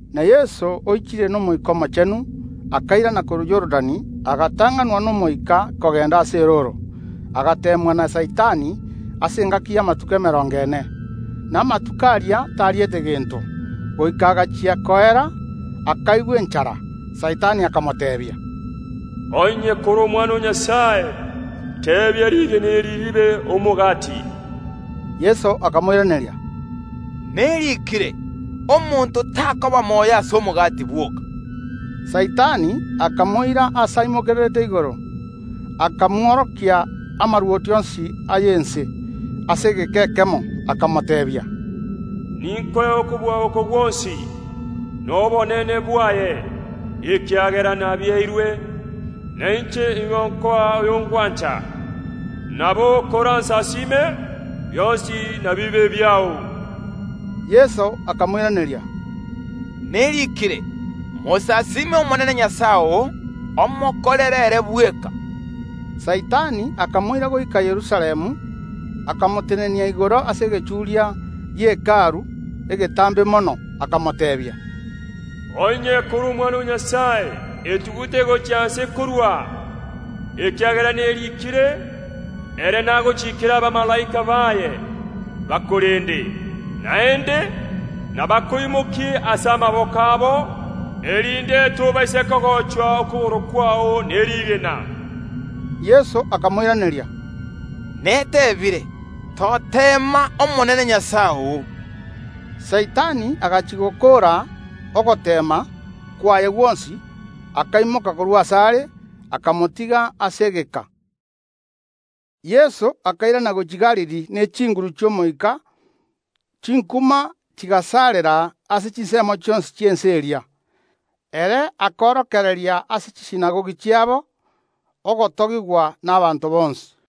Na Yeso oichire n’Omoika Omochenu, akairana korwa Yorodani, agatang’anwa n’Omoika kogenda ase erooro, agateemwa na Saitani ase engaki y’amatuko emerongo ene. Na amatuko aria tariete gento. Goika agachia koera, akaigwa enchara. Saitani akamoteebia, “Onye kore Omwana o Nyasae, teebia rigena eri ribe omogati.” Yeso akamoiraneria, “Neriikire. Omonto takoba moyo ase omogati bwoka.” Saitani akamoira aase aimokererete igoro, akamworokia amarwoti onsi ay’ense ase egeka ekemo, akamoteebia, “Ninkoe okobua oko gwonsi, na obonene bwaye, ekiagera nabieirwe, na inche iga nkoa oyo ngwancha. Nabo koransasiime, bionsi nabibe ebiao.” Yeso akamoiraneria, “Neriikire: Mosasiime Omonene Nyasae oo, omokorere ere bweka.” Saitani akamoira goika Yerusalemu, akamotenenia igoro ase egechuria gie Hekalu egetambe mono, akamoteebia, Onye kore Omwana o Nyasae, etugute gochia inse korwa aa, ekiagera neriikire: Ere nagochikere abamalaika baye bakorende, naende: Nabakoimokie ase amaboko abo, erinde tobaisa kogochwa okogoro kwao ne rigena. Yeso akamoiraneria, “Neteebire, Toteema Omonene Nyasae oo.” Saitani agachia gokoora ogoteema kwaye gwonsi, akaimoka korwa asare, akamotiga ase egeka. Yeso akairana gochia Galili ne chinguru chi’Omoika, chinkuma chigasarera ase chinsemo chionsi chi’ense eria. Ere akorokereria ase chisinagogi chiabo, ogotogigwa nabaanto bonsi.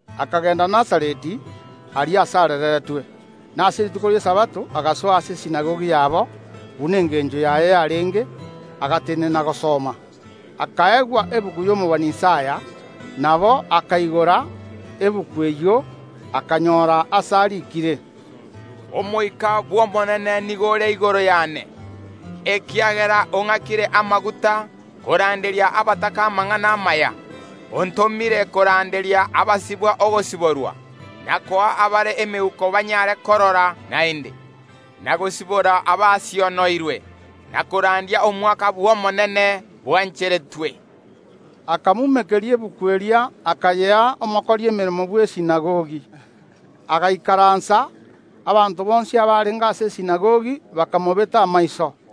Akagenda Nazareti, aria ase arereretwe; na ase rituko ri’Esabato agasoa ase esinagogi yabo, buna engencho yaye yarenge, agatenena gosoma. Akaegwa egetabu y’omobani Isaya. Nabo akaigora egetabu eyio, akanyora aase ariikire, Omoika bw’Omonene nigo ore igoro yane, ekiagera ong’akire amaguta koranderia abataka amang’ana amaya. Ontomire koranderia abasibwa ogosiborwa, na koa abare emeuko banyare korora naende, na gosibora abasionoirwe. Na korandia omwakabwo Omonene bwancheretwe. Akamumekeria egetabu eria akayea omokori emeremo bw’esinagogi, agaikaransa. Abanto bonsi abarenge ase esinagogi bakamobeta amaiso.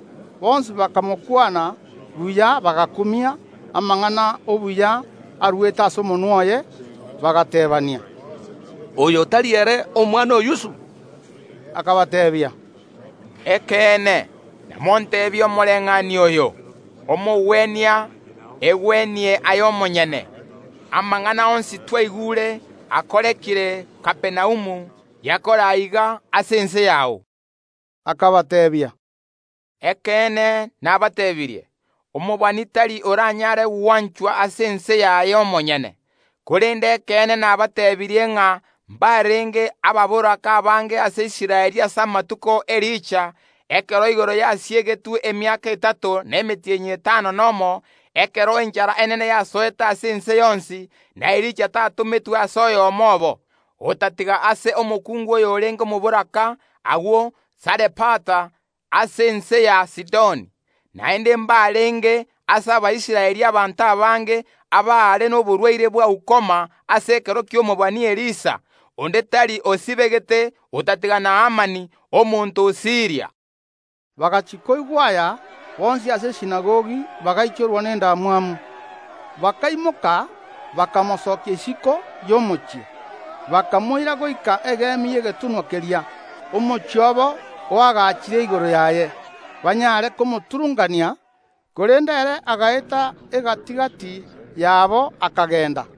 Bonsi bakamokwana buya bagakumia amang’ana obuya aruete ase omonwa oye, bagateebania, “Oyo tari ere omwana o Yusufu?” Akabateebia, “Ekeene, namonteebie omoreng’anio oyo: Omogwenia, egwenie aye omonyene; amang’ana onsi twaigure akorekire Kapernaumu, yakore aiga ase ense yao.” Akabateebia, “Ekeene nabateebirie: Omobani tari oranyare gwanchwa ase ense yaye omonyene. Korende ekeene nabateebirie ng’a mbarenge ababoraka abange ase Israeli ase amatuko ’Elija, ekero igoro yasiegetwe emiaka etato na emetienyi etano nomo, ekero enchara enene yasoete ase ense yonsi; na Elija tatometwe ase oyomo obo, otatiga ase omokungu oyorenge omoboraka agwo Sarefata, ase ense ya Sidoni. Naende mbarenge ase Abaisraeli abanto abange abaare noborwaire bwa ukoma ase ekero ki’omobani Elisha; onde tari osibegete otatiga Naamani, omonto o Siiria.” Bagachia koigwa aya, bonsi ase esinagogi bagaichorwa nendamwamu. Bakaimoka bakamosokia isiko y’omochie, bakamoira goika igoro y’egetunwa keria omochie obo oagachire erio, banyare komoturunkania. Korende ere agaeta egati‐gati yabo, akagenda.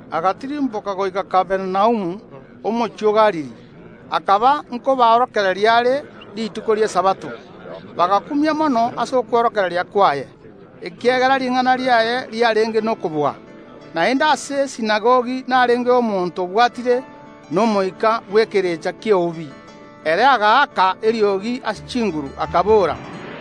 Agatirimboka goika Kapernaumu, omochie o Galili. Akaba nkoborokereria are rituko ri’Esabato. Bagakumia mono ase okworokereria kwaye, ekiagera ring’ana riaye riarenge nokobua. Naende ase esinagogi narengeo omonto obwatire n’Omoika bw’ekerecha ki’eubi. Ere agaaka eriogi ase chinguru, akabora,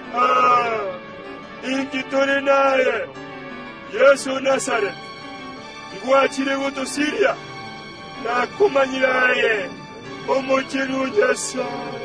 “Ah! Totige intwe Inki tore naye, Yeso o Nazareti? Ngwachire gotosiria? Nakomanyire aye, Omochenu o Nyasae.”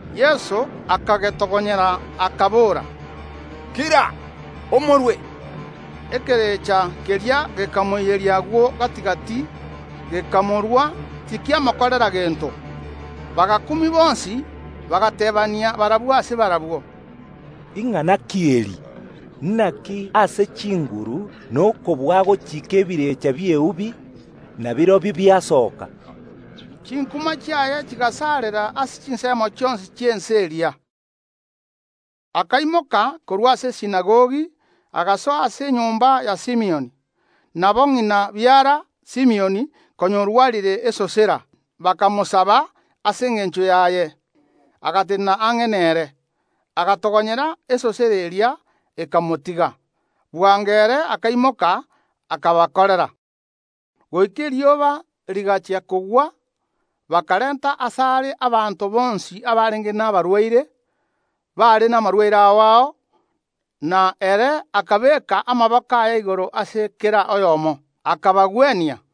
Yeso akagetogonyera, akabora, “Kira, omorwe!” Ekerecha keria gekamoiyeria agwo gati‐gati, gekamorwa, tikiamokorera gento. Bagakumia bonsi, bagateebania barabwo ase barabwo, “Ing’ana ki eri? Naki ase chinguru na okobua kiagochika ebirecha bi’eubi, na birobio biasoka.” Chinkuma chiaye chigasarera ase chinsemo chionsi chi’ense eria. Akaimoka korwa ase esinagogi, agasoa ase enyomba ya Simioni. Nabo ng’ina biara Simioni konya orwarire esosera; bakamosaba ase engencho yaye. Agatenena ang’e nere, agatogonyera esosera eria; ekamotiga. Bwango ere akaimoka akabakorera. Goika erioba rigachia kogwa bakarenta asare abanto bonsi abarenge nabarwaire bare namarwaire ao ao, na ere akabeeka amaboko aye igoro ase kera oyomo, akabagwenia.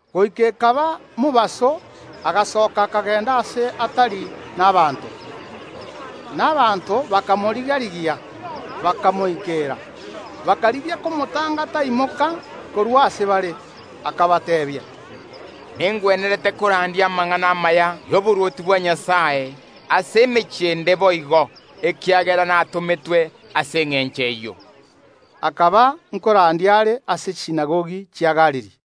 Goika ekaba mobaso, agasoka, akagenda aase atari nabaanto. Na abanto bakamoriga‐rigia, bakamoikera, bakarigia komotanga taimoka korwa ase bare. Akabateebia, “Nengwenerete korandia amang’ana amaya ay’oborwoti bwa Nyasae ase emechie ende boigo, ekiagera natometwe ase engencho eyio.” Akaba nkorandia are ase chisinagogi chia Boyahudi.